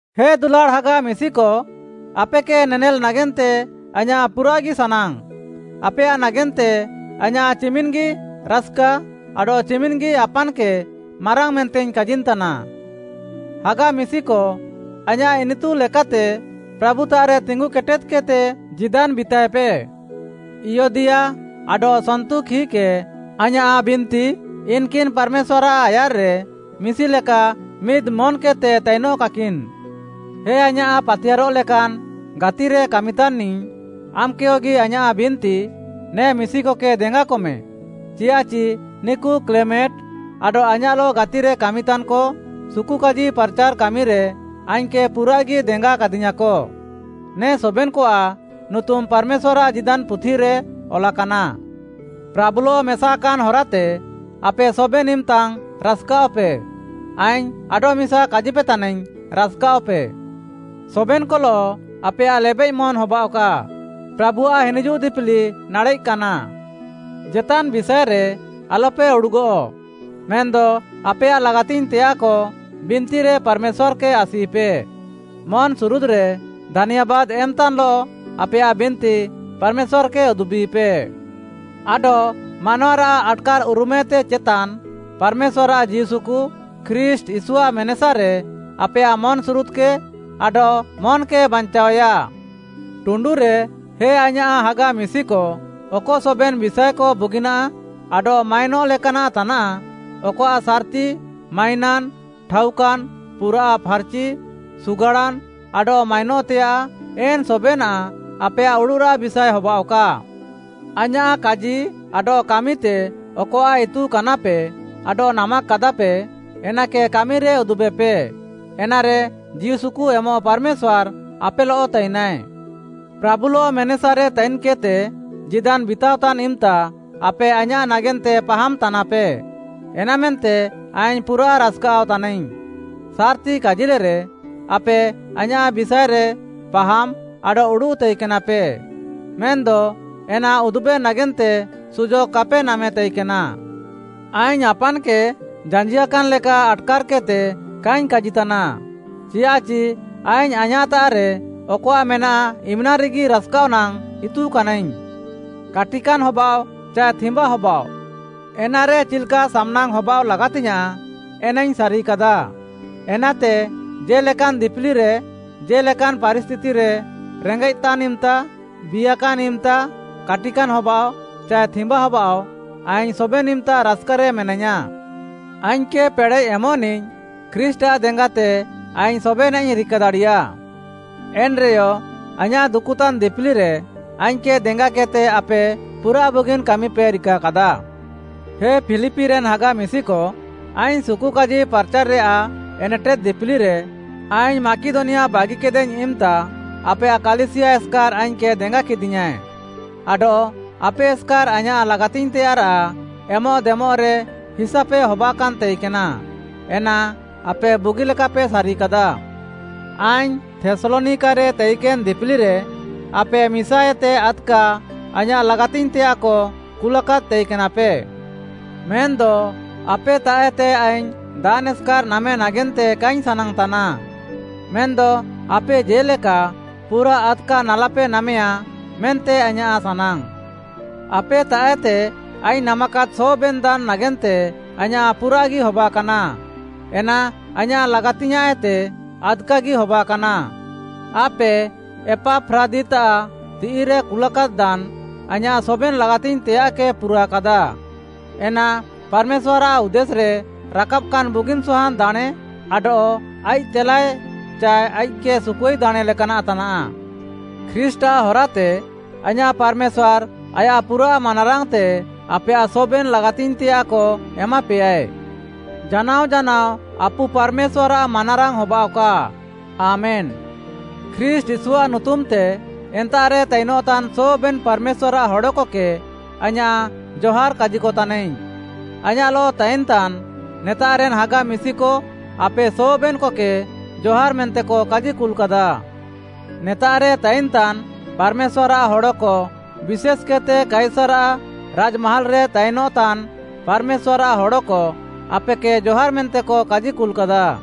ହେ ଦୁଲାଡ଼୍‌ ହାଗା ମିଶିକ, ଆପେକେ ନେନେଲ୍‌ ନାଗେନ୍ତେ ଆଇଁୟାଃ ପୁରାଃଗି ସାନାଙ୍ଗ୍‌। ଆପେୟାଃ ନାଗେନ୍ତେ ଆଇଁୟାଃ ଚିମିନ୍‌ଗି ରାସ୍‌କା ଆଡଃ ଚିମିନ୍‌ଗି ଆପାନ୍‌କେ ମାରାଙ୍ଗ୍‌ ମେନ୍ତେଇଙ୍ଗ୍‌ କାଜିନ୍‌ତାନା। ହାଗା ମିଶିକ ଆଇଁୟାଃ ଇନିତୁ ଲେକାତେ ପ୍ରାଭୁତାଃରେ ତିଙ୍ଗୁକେଟେଦ୍‌କେଦ୍‌ତେ ଜୀଦାନ୍‌ ବିତାଏପେ। ଇୟଦିଆ ଆଡଃ ସନ୍ତୁଖୀକେ ଆଇଁୟାଃ ବିନ୍ତି, ଇନ୍‌କିନ୍‌ ପାର୍‌ମେଶ୍ୱାର୍‌ଆଃ ଆୟାର୍‌ରେ ମିଶିଲେକା ମିଦ୍‌ମନ୍‌କେଦ୍‌ତେ ତାଇନଃକାକିନ୍‌। ହେ ଆଇଁୟାଃ ପାତିୟାର୍‌ରଃ ଲେକାନ୍‌ ଗାତିରେ କାମିତାନ୍‌ନିଃ। ଆମ୍‌କେୟଗି ଆଇଁୟାଃ ବିନ୍ତି, ନେ ମିଶିକକେ ଦେଙ୍ଗାକମେ, ଚିୟାଃଚି ନିକୁ କ୍ଲେମେଣ୍ଟ୍‌ ଆଡଃ ଆଇଁୟାଃଲଃ ଗାତିରେ କାମିତାନ୍‌କ, ସୁକୁକାଜି ପାର୍‌ଚାର୍‌ କାମିରେ ଆଇଙ୍ଗ୍‌କେ ପୁରାଃଗି ଦେଙ୍ଗାକାଦିୟାଁକ। ନେ ସବେନ୍‌କଆଃ ନୁତୁମ୍‌ ପାର୍‌ମେଶ୍ୱାର୍‌ଆଃ ଜୀଦାନ୍‌ ପୁଥିରେ ଅଲାକାନା। ପ୍ରାଭୁଲଃ ମେସାକାନ୍‌ ହରାତେ ଆପେ ସବେନ୍‌ ଇମ୍‌ତାଙ୍ଗ୍‌ ରାସ୍‌କାଅଃପେ। ଆଇଙ୍ଗ୍‌ ଆଡଃମିସା କାଜିପେତାନାଇଙ୍ଗ୍‌ ରାସ୍‌କାଅଃପେ। ସବେନ୍‌କଲଃ ଆପେୟାଃ ଲେବେଃମନ୍‌ ହବାଅଃକା। ପ୍ରାଭୁଆଃ ହିନିଜୁଃ ଦିପିଲି ନାଡ଼େଃକାନା। ଜେତାନ୍‌ ବିଷାଏରେ ଆଲ୍‌ପେ ଉଡ଼ୁଗଃ, ମେନ୍‌ଦ ଆପେୟାଃ ଲାଗାତିଙ୍ଗ୍‌ତେୟାଃକ ବିନ୍ତିରେ ପାର୍‌ମେଶ୍ୱାର୍‌କେ ଆସିପେ। ମନ୍‌ସୁରୁଦ୍‌ରେ ଧାନ୍ୟାବାଦ୍‌ ଏମ୍‌ତାନ୍‌ଲଃ ଆପେୟାଃ ବିନ୍ତି ପାର୍‌ମେଶ୍ୱାର୍‌କେ ଉଦୁବିପେ। ଆଡଃ ମାନୱାରାଃ ଆଟ୍‌କାର୍‌ଉରୁମ୍‌ଏତେ ଚେତାନ୍‌, ପାର୍‌ମେଶ୍ୱାର୍‌ଆଃ ଜୀଉସୁକୁ ଖ୍ରୀଷ୍ଟ୍‌ ୟୀଶୁଆଃ ମେନେସାରେ ଆପେୟାଃ ମନ୍‌ସୁରୁଦ୍‌କେ ଆଡଃ ମନ୍‌କେ ବାଞ୍ଚାଅୟା। ଟୁଣ୍ଡୁରେ, ହେ ଆଇଁୟାଃ ହାଗା ମିଶିକ, ଅକ ସବେନ୍‌ ବିଷାଏକ ବୁଗିନାଃ ଆଡଃ ମାଇନଃ ଲେକାନାଃ ତାନାଃ, ଅକଆଃ ସାର୍‌ତି, ମାଇନାନ୍‌, ଠାଉକାନ୍‌, ପୁରାଃ ଫାର୍‌ଚି, ସୁଗାଡ଼ାନ୍‌, ଆଡଃ ମାଇନଃତେୟାଃ, ଏନ୍‌ ସବେନାଃ ଆପେୟାଃ ଉଡ଼ୁଃରାଃ ବିଷାଏ ହବାଃଅକା। ଆଇଁୟାଃ କାଜି ଆଡଃ କାମିତେ ଅକଆଃ ଇତୁକାନାପେ ଆଡଃ ନାମାକାଦାପେ, ଏନାକେ କାମିରେ ଉଦୁବେପେ। ଏନାରେ, ଜୀଉସୁକୁ ଏମଃ ପାର୍‌ମେଶ୍ୱାର୍‌ ଆପେଲଃ ତାଇନାଏ। ପ୍ରାଭୁଲଃ ମେନେସାରେ ତାଇନ୍‌କେଦ୍‌ତେ ଜୀଦାନ୍‌ ବିତାଅତାନ୍‌ ଇମ୍‌ତା ଆପେ ଆଇଁୟାଃ ନାଗେନ୍ତେ ପାହାମ୍‌ତାନାପେ ଏନାମେନ୍ତେ ଆଇଙ୍ଗ୍‌ ପୁରାଃ ରାସ୍‌କାଅଃତାନାଇଙ୍ଗ୍‌। ସାର୍‌ତି କାଜିଲେରେ, ଆପେ ଆଇଁୟାଃ ବିଷାଏରେ ପାହାମ୍‌ ଆଡଃ ଉଡ଼ୁଃ ତାଇକେନାପେ, ମେନ୍‌ଦ ଏନା ଉଦୁବେ ନାଗେନ୍ତେ ସୁଯୋଗ୍‌ କାପେ ନାମେ ତାଇକେନା। ଆଇଙ୍ଗ୍‌ ଆପାନ୍‌କେ ଜାଞ୍ଜିଆକାନ୍‌ ଲେକା ଆଟ୍‌କାର୍‌କେଦ୍‌ତେ କାଇଙ୍ଗ୍‌ କାଜିତାନା, ଚିଆଃଚି ଆଇଙ୍ଗ୍‌ ଆଇଁୟାଃତାଃରେ ଅକଆଃ ମେନାଃ ଇମ୍‌ନାଙ୍ଗ୍‌ରେଗି ରାସ୍‌କାଅଃ ନାଙ୍ଗ୍‌ ଇତୁକାନାଇଙ୍ଗ୍‌। କାଟିକାନ୍‌ ହବାଃଅ ଚାଏ ଥିମ୍ବା ହବାଃଅ, ଏନାରେ ଚିଲ୍‌କା ସାମ୍‌ନାଙ୍ଗ୍‌ ହବାଅଃ ଲାଗାତିଙ୍ଗ୍‌ୟାଁଃ ଏନାଇଙ୍ଗ୍‌ ସାରିକାଦା। ଏନାତେ ଜେ'ଲେକାନ୍‌ ଦିପିଲିରେ, ଜେ'ଲେକାନ୍‌ ପାରିସ୍ଥିତିରେ, ରେଙ୍ଗେଃତାନ୍‌ ଇମ୍‌ତା, ବିୟାକାନ୍‌ ଇମ୍‌ତା, କାଟିକାନ୍‌ ହବାଃଅ ଚାଏ ଥିମ୍ବା ହବାଃଅ ଆଇଙ୍ଗ୍‌ ସବେନ୍‌ ଇମ୍‌ତା ରାସ୍‌କାରେ ମେନାଇୟାଁ। ଆଇଙ୍ଗ୍‌କେ ପେଡ଼େଃ ଏମଃନିଃ ଖ୍ରୀଷ୍ଟ୍‌ଆଃ ଦେଙ୍ଗାତେ ଆଇଙ୍ଗ୍‌ ସବେନାଃଇଙ୍ଗ୍‌ ରିକାଦାଡ଼ିୟା। ଏନ୍‌ରେୟ ଆଇଁୟାଃ ଦୁକୁତାନ୍‌ ଦିପିଲିରେ ଆଇଙ୍ଗ୍‌କେ ଦେଙ୍ଗାକେଦ୍‌ତେ ଆପେ ପୁରାଃ ବୁଗିନ୍‌ କାମିପେ ରିକାକାଦା। ହେ ଫିଲିପିରେନ୍‌ ହାଗା ମିଶିକ, ଆଇଙ୍ଗ୍‌ ସୁକୁକାଜି ପାର୍‌ଚାର୍‌ରେୟାଃ ଏନେଟେଦ୍‌ ଦିପିଲିରେ, ଆଇଙ୍ଗ୍‌ ମାକିଦନିଆ ବାଗିକେଦାଇଙ୍ଗ୍‌ ଇମ୍‌ତା ଆପେୟାଃ କାଲିସିୟା ଏସ୍‌କାର୍‌ ଆଇଙ୍ଗ୍‌କେ ଦେଙ୍ଗାକେଦିୟାଁ, ଆଡଃ ଆପେ ଏସ୍‌କାର୍‌ ଆଇଁୟାଃ ଲାଗାତିଙ୍ଗ୍‌ତେୟାଃରାଃ ଏମଃଦେମଃରେ ହିସାପେ ହବାକାନ୍‌ ତାଇକେନା। ଏନା ଆପେ ବୁଗିଲେକାପେ ସାରିକାଦା। ଆଇଙ୍ଗ୍‌ ଥେସ୍‌ଲନିକାରେ ତାଇକେନ୍‌ ଦିପିଲିରେ, ଆପେ ମିସାଏତେ ଆଦ୍‌କା ଆଇଁୟାଃ ଲାଗାତିଙ୍ଗ୍‌ତେୟାଃକ କୁଲାକାଦ୍‌ ତାଇକେନାପେ। ମେନ୍‌ଦ ଆପେତାଃଏତେ ଆଇଙ୍ଗ୍‌ ଦାନ୍‌ ଏସ୍‌କାର୍‌ ନାମେ ନାଗେନ୍ତେ କାଇଙ୍ଗ୍‌ ସାନାଙ୍ଗ୍‌ତାନା, ମେନ୍‌ଦ ଆପେ ଜେ'ଲେକା ପୁରାଃ ଆଦ୍‌କା ନାଲାପେ ନାମେୟାଁ, ମେନ୍ତେ ଆଇଁୟାଃ ସାନାଙ୍ଗ୍‌। ଆପେତାଃଏତେ ଆଇଙ୍ଗ୍‌ ନାମାକାଦ୍‌ ସବେନ୍ ଦାନ୍ ନାଗେନ୍ତେ ଆଇଁୟାଃ ପୁରାଃଗି ହବାକାନା। ଏନା ଆଇଁୟାଃ ଲାଗାତିଙ୍ଗ୍‌ୟାଁଃଏତେ ଆଦ୍‌କାଗି ହବାକାନା। ଆପେ ଏପାଫ୍ରାଦିତ୍‌ଆଃ ତିଃଇରେ କୁଲାକାଦ୍‌ ଦାନ୍, ଆଇଁୟାଃ ସବେନ୍ ଲାଗାତିଙ୍ଗ୍‌ତେୟାଃକେ ପୁରାକାଦା, ଏନା ପାର୍‌ମେଶ୍ୱାର୍‌ଆଃ ଉଦ୍ଦେଶ୍‌ରେ ରାକାବାକାନ୍‌ ବୁଗିନ୍‌ ସହାନ୍‌ ଦାଣେଁ ଆଡଃ ଆଇଃକ୍‌ ତେଲାଏ ଚାଏ ଆଇଃକ୍‌କେ ସୁକୁଆଇ ଦାଣେଁ ଲେକାନାଃ ତାନାଃ। ଖ୍ରୀଷ୍ଟ୍‌ଆଃ ହରାତେ ଆଇଁୟାଃ ପାର୍‌ମେଶ୍ୱାର୍‌ ଆୟାଃ ପୁରାଃ ମାନାରାଙ୍ଗ୍‌ତେ ଆପେୟାଃ ସବେନ୍‌ ଲାଗାତିଙ୍ଗ୍‌ତେୟାଃକ ଏମାପେୟାଏ। ଜାନାଅ ଜାନାଅ ଆପୁ ପାର୍‌ମେଶ୍ୱାର୍‌ଆଃ ମାନାରାଙ୍ଗ୍‌ ହବାଅଃକା। ଆମେନ୍‌। ଖ୍ରୀଷ୍ଟ୍‌ ୟୀଶୁଆଃ ନୁତୁମ୍‌ତେ ଏନ୍ତାଃରେ ତାଇନଃତାନ୍‌ ସବେନ୍‌ ପାର୍‌ମେଶ୍ୱାର୍‌ଆଃ ହଡ଼କକେ ଆଇଁୟାଃ ଜହାର୍‌ କାଜିକତାନାଇଙ୍ଗ୍‌। ଆଇଁୟାଃଲଃ ତାଇନ୍‌ତାନ୍‌ ନେତାଃରେନ୍‌ ହାଗା ମିଶିକ ଆପେ ସବେନ୍‌କକେ ଜହାର୍‌ ମେନ୍ତେକ କାଜିକୁଲ୍‌କାଦା। ନେତାଃରେ ତାଇନ୍‌ତାନ୍‌ ପାର୍‌ମେଶ୍ୱାର୍‌ଆଃ ହଡ଼କ, ବିଶେଷ୍‌କେଦ୍‌ତେ କାଇସାର୍‌ଆଃ ରାଜ୍‌ମାହାଲ୍‌ରେ ତାଇନ୍‌ତାନ୍‌ ପାର୍‌ମେଶ୍ୱାର୍‌ଆଃ ହଡ଼କ ଆପେକେ ଜହାର୍ ମେନ୍ତେକ କାଜିକୁଲ୍‌କାଦା।